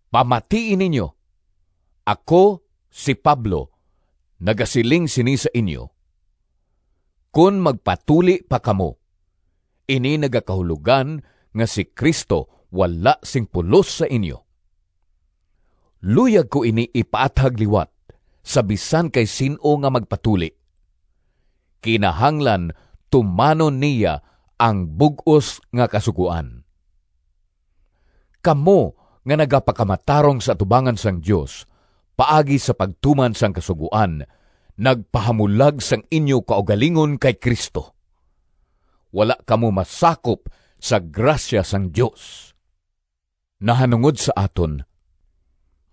Pamatii ninyo! Ako, si Pablo, nagasiling sini sa inyo: kon magpatuli pa kamo, ini nagakahulogan nga si Cristo wala sing pulos sa inyo. Luyag ko ini ipaathag liwat sa bisan kay sin-o nga magpatuli: kinahanglan tumanon niya ang bug-os nga Kasugoan. Kamo nga nagapakamatarong sa atubangan sang Dios paagi sa pagtuman sang Kasugoan nagpahamulag sang inyo kaugalingon kay Cristo. Wala kamo masakop sa grasya sang Dios. Nahanungod sa aton,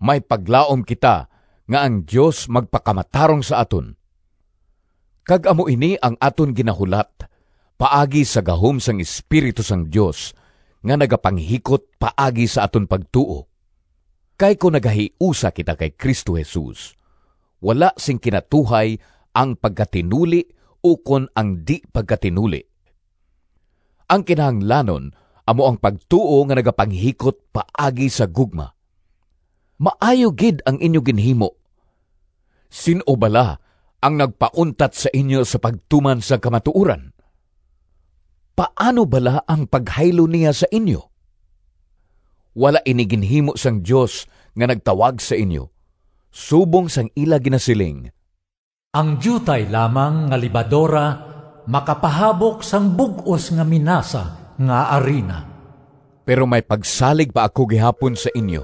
may paglaom kita nga ang Dios magpakamatarong sa aton, kag amo ini ang aton ginahulat paagi sa gahom sang Espiritu sang Dios nga nagapanghikot paagi sa aton pagtuo. Kay kon nagahiusa kita kay Cristo Jesus, wala sing kinatuhay ang pagkatinuli ukon ang di-pagkatinuli. Ang kinahanglanon amo ang pagtuo nga nagapanghikot paagi sa gugma. Maayo gid ang inyo ginhimo! Sin-o bala ang nagpauntat sa inyo sa pagtuman sang kamatuoran? Paano bala ang paghaylo niya sa inyo? Wala ini ginhimo sang Dios nga nagtawag sa inyo. Subong sang ila ginasiling, “Ang diutay lamang nga lebadora makapahabok sang bug-os nga minasa nga arina.” Pero may pagsalig pa ako gihapon sa inyo.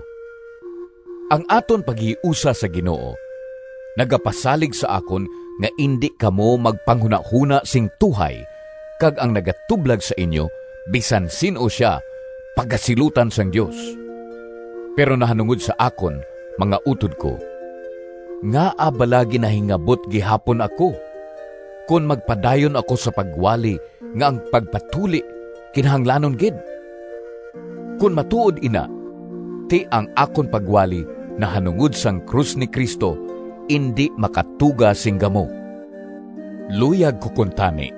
Ang aton paghiusa sa Ginoo nagapasalig sa akon nga indi kamo magpanghunahona sing tuhay kag ang nagatublag sa inyo, bisan sin-o sia, pagasilutan sang Dios. Pero nahanungod sa akon, mga utod ko, ngaa bala ginahingabot gihapon ako kon magpadayon ako sa pagwali nga ang pagpatuli kinahanglanon gid? Kon matuod ina, ti ang akon pagwali nahanungod sang krus ni Cristo indi makatuga sing gamo. Luyag ko kuntani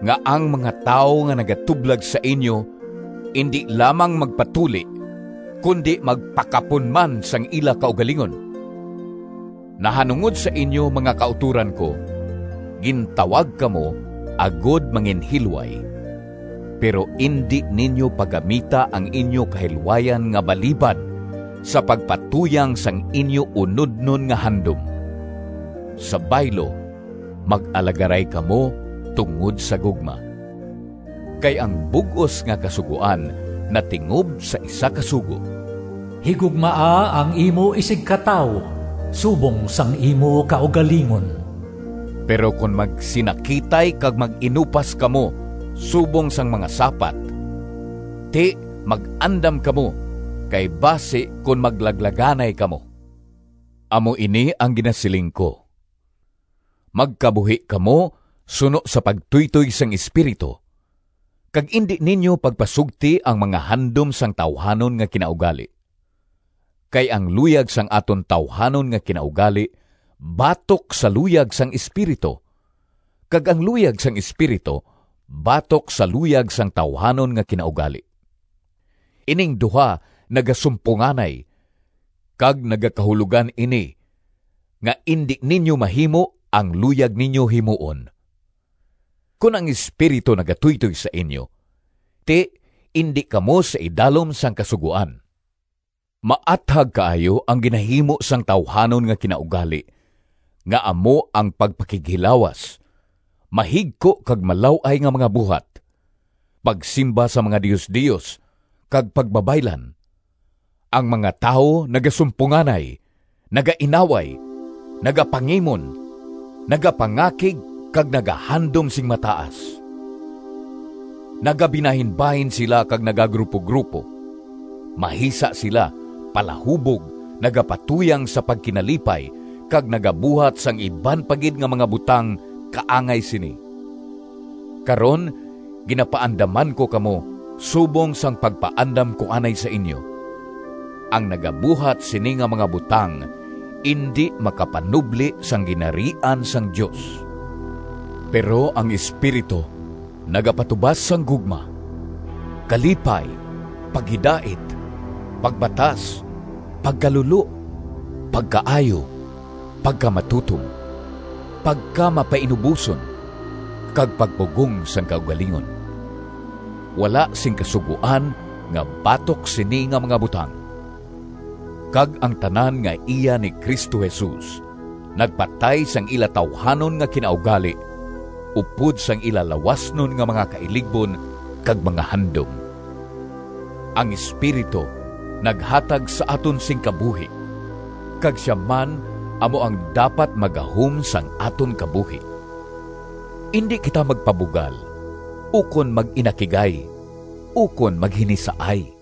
nga ang mga tawo nga nagatublag sa inyo indi lamang magpatuli kundi magpakapon man sang ila kaugalingon! Nahanungod sa inyo, mga kautoran ko, gintawag kamo agod manginhilway. Pero indi ninyo paggamita ang inyo kahilwayan nga balibad sa pagpatuyang sang inyo unodnon nga handom. Sa baylo, mag-alagaray kamo tungod sa gugma. Kay ang bug-os nga Kasugoan natingob sa isa ka sugo: “Higugmaa ang imo isigkatawo subong sang imo kaugalingon.” Pero kon magsinakitay kag mag-inupas kamo subong sang mga sapat, ti mag-andam kamo, kay basi kon maglaglaganay kamo. Amo ini ang ginasiling ko: magkabuhi kamo suno sa pagtuytoy sang Espiritu, kag indi ninyo pagpasugti ang mga handom sang tawuhanon nga kinaugali. Kay ang luyag sang aton tawuhanon nga kinaugali batok sa luyag sang Espiritu, kag ang luyag sang Espiritu batok sa luyag sang tawuhanon nga kinaugali. Ining duha nagasumponganay, kag nagakahulogan ini nga indi ninyo mahimo ang luyag ninyo himuon. Kon ang Espiritu nagatuytoy sa inyo, ti indi kamo sa idalom sang Kasugoan. Maathag kaayo ang ginahimo sang tawuhanon nga kinaugali nga amo ang pagpakighilawas, mahigko kag malaw-ay nga mga buhat; pagsimba sa mga diosdios, kag pagbabaylan. Ang mga tawo nagasumponganay, nagainaway, nagapangimon, nagapangakig kag nagahandom sing mataas. Nagabinahinbahin sila kag nagagrupogrupo; mahisa sila, palahubog, nagapatuyang sa pagkinalipay, kag nagabuhat sang iban pa gid nga mga butang kaangay sini. Karon, ginapaandaman ko kamo subong sang pagpaandam ko anay sa inyo: ang nagabuhat sini nga mga butang indi makapanubli sang Ginharian sang Dios. Pero ang Espiritu nagapatubas sang gugma, kalipay, paghidait, pagbatas, pagkalulo, pagkaayo, pagkamatutom, pagkamapainuboson, kag pagpugong sang kaugalingon. Wala sing kasugoan nga batok sini nga mga butang. Kag ang tanan nga iya ni Cristo Jesus nagpatay sang ila tawuhanon nga kinaugali upod sang ila lawasnon nga mga kailigbon kag mga handom. Ang Espiritu naghatag sa aton sing kabuhi, kag sia man amo ang dapat maggahom sang aton kabuhi. Indi kita magpabugal, ukon mag-inakigay, ukon maghinisaay.